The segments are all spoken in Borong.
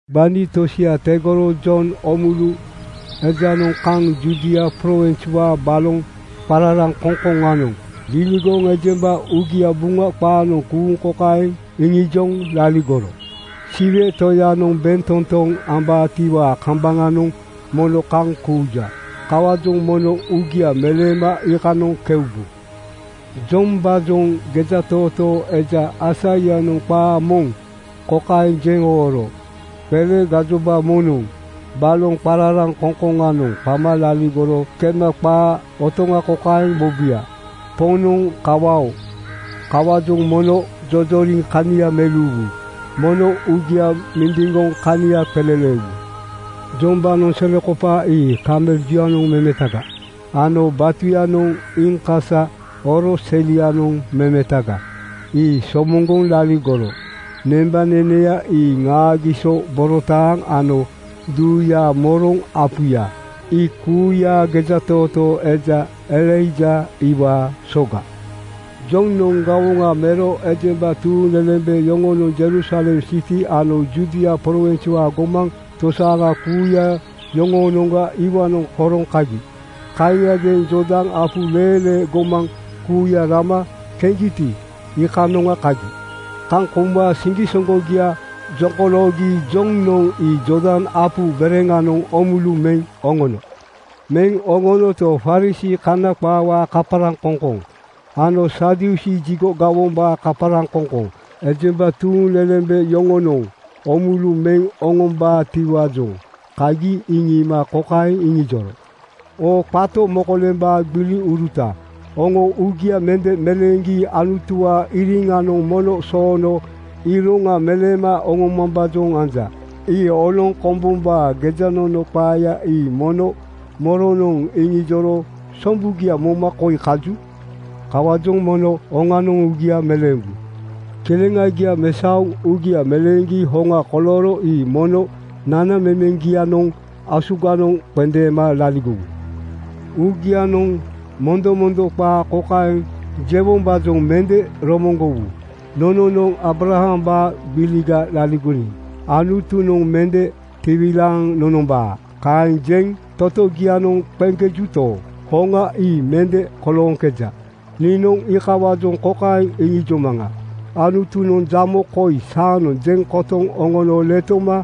Gbani tosia tegoro Jon Oomulu ejanoŋ kaŋ Judia prowinswaa baloŋ qararaŋkoŋkoŋanoŋ liligoŋ ejemba uugia Buŋa qaanoŋ kuuŋ kokaeŋ iŋijoŋ laligoro, “Siwe Toyanoŋ bentotoŋa ambaatiwaa kambaŋanoŋ mono kaŋ kuuja. Kawaajoŋ mono uugia meleema iikanoŋ keubu.” Jombaajoŋ gejatootoo eja Aisaianoŋ qaa moŋ kokaeŋ jeŋ ooro, “Qele gajoba moŋnoŋ baloŋ qararaŋkoŋkoŋanoŋ qama laligoro kema qaa otoŋa kokaeŋ mobuya, ‘Poŋnoŋ kawa-oo! Kawaajoŋ mono jojoriŋ kania meleuwu. Mono uugia mindiŋgoŋ kania qeleleewu.’” Jombaanoŋ selekopaa ii kamel juyanoŋ memetaga ano batuyanoŋ iiŋkasa oro selianoŋ memetaga ii somoŋgoŋ laligoro. Nembaneneya ii ŋaagiso borotaaŋ ano duuyaa moroŋ apuya. Ii kuuya gejatootoo eja Elaija iwaa soga. Jonoŋ gawoŋa mero ejemba tuuŋlelembe yoŋonoŋ Jerusalem siti ano Judia prowinswaa gomaŋ tosaaŋa kuuya yoŋoonoŋga iwaanoŋ horoŋ kagi. Kaaŋiadeeŋ Jordan apu leelee gomaŋ kuuya rama keŋgiti, iikanoŋa kagi. Kaŋ kouma siŋgisoŋgogia jokoloogi Jonoŋ ii Jordan apu bereŋanoŋ oomulu meŋ oŋono. Meŋ oŋonoto, Farisii (Kana qaawaa kaparaŋkoŋkoŋ) ano Sadusii (Jigo gawombaa kaparaŋkoŋkoŋ) ejemba tuuŋlelembe yoŋonoŋ oomulu meŋ oŋombaatiwaajoŋ kagi iŋiima kokaeŋ iŋijoro, “Oo qato mokolembaa gbiliuruta, oŋo uugia mende meleeŋgi Anutuwaa iriŋanoŋ mono soono iroŋa meleema oŋomambaajoŋ anja. Ii oloŋ kombombaa gejanono qaaya ii mono moronoŋ iŋijoro sombugia moma koi kaju? Kawaajoŋ mono oŋanoŋ uugia meleembu. Kileŋagia mesaoŋ uugia meleeŋgi hoŋa kolooro ii mono nanamemeŋgianoŋ asuganoŋ qendeema laligowu. Uugianoŋ mondomondo qaa kokaeŋ jewombaajoŋ mende romoŋgowu, ‘Nononoŋ Aabrahambaa gbiliga laligoniŋ Anutunoŋ mende tiwilaaŋ nonombaa.’ Kaeŋ jeŋ totogianoŋ qeŋkejuto, hoŋa ii mende kolooŋkeja. Niinoŋ iikawaajoŋ kokaeŋ iŋijomaŋa, Anutunoŋ jamo koi saanoŋ jeŋ kotoŋ oŋono letoma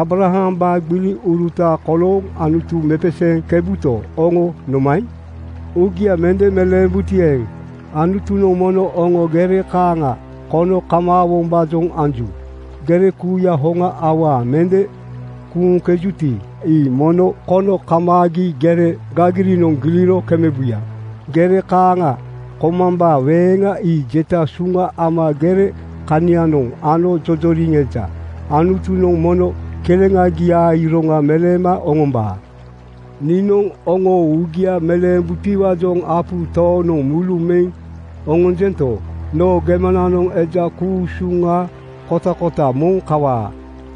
Aabrahambaa gbiliuruta kolooŋ Anutu mepeseeŋkebuto, oŋo nomaeŋ? Uugia mende meleembuti eeŋ, Anutunoŋ mono oŋo gere kaaŋa kono kamaawombaajoŋ anju. Gere kuuya hoŋa awaa mende kuuŋkejuti, ii mono kono kamaagi gere gagirinoŋ giliro kemebuya. Gere kaaŋa komambaa weŋa ii jeta suŋa ama gere kanianoŋ ano jojoriŋ eja. Anutunoŋ mono kileŋagiaa iroŋa meleema oŋombaa. Niinoŋ oŋo uugia meleembutiwaajoŋ apu tooŋnoŋ mulu meŋ oŋonjento, noo gemananoŋ eja ku-usuŋa kotakota moŋ kawaa.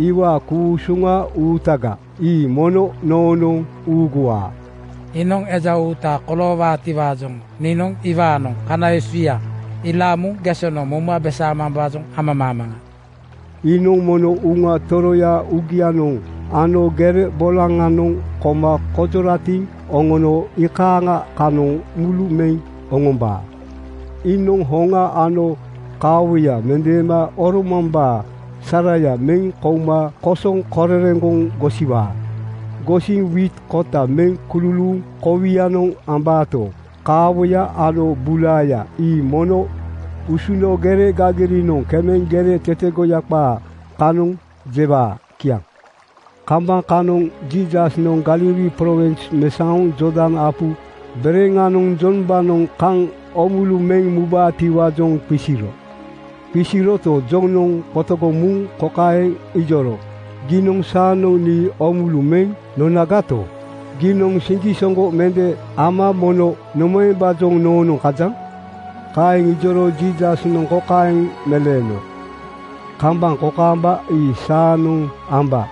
Iwaa ku-usuŋa uutaga ii mono noonoŋ uuguwaa. Iinoŋ eja uuta koloowaatiwaajoŋ niinoŋ iwaanoŋ kana esuya ilaaŋ muŋ gesonoŋ mouma besaamambaajoŋ amamaamaŋa. Iinoŋ mono Uŋa Toroya uugianoŋ ano gere bolaŋanoŋ koma konjoratiŋ oŋono iikaaŋa kanoŋ mulu meŋ oŋombaa. Iinoŋ hoŋa ano kaawoya mendeema oromambaa saraya meŋ kouma kosoŋ korereŋgoŋ gosiwaa. Gosiŋ wiit kota meŋ kululuuŋ kowianoŋ ambaato, kaawoya ano bulaaya ii mono usuno gere gagirinoŋ kemeŋ gere tetegoya qaa kanoŋ jewaa.” Kiaŋ. Kambaŋ kanoŋ Jiisasnoŋ Galili prowins mesaoŋ Jordan apu bereŋanoŋ Jombaanoŋ kaŋ oomulu meŋ mubaatiwaajoŋ qisiro. Qisiroto, Jonoŋ qotogoŋ muŋ kokaeŋ ijoro, “Giinoŋ saanoŋ nii oomulu meŋ nonagato, giinoŋ siŋgisoŋgo mende ama mono nomaembaajoŋ noonoŋ kajaŋ?” Kaeŋ ijoro Jiisasnoŋ kokaeŋ meleeno, “Kambaŋ kokaamba ii saanoŋ amba.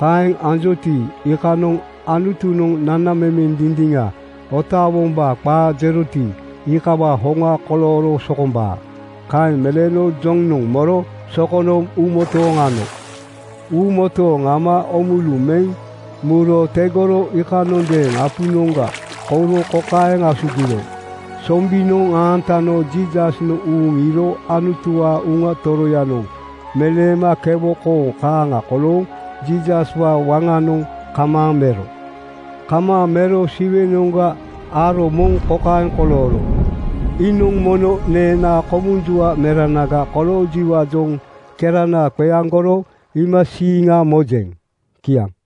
Kaeŋ anjoti, iikanoŋ Anutunoŋ nanamemeŋ dindiŋa otaawombaa qaa jeroti, iikawaa hoŋa kolooro sokombaa.” Kaeŋ meleeno Jonoŋ moro sokono uumotooŋ ano. Uumotooŋ ama oomulu meŋ muro tegoro iikanondeeŋ apunoŋga kouro kokaeŋ asugiro: Sombinoŋ aantano Jiisasnoŋ uuŋ iiro Anutuwaa Uŋa Toroyanoŋ meleema kewo kooŋ kaaŋa kolooŋ Jiisaswaa waŋanoŋ kamaaŋ mero. Kamaaŋ mero Siwenoŋga aro moŋ kokaeŋ kolooro, “Iinoŋ mono neenaa komunjua meranaga koloojiwaajoŋ kerana qeaŋgoro iimasiiŋa mojeŋ.” Kiaŋ.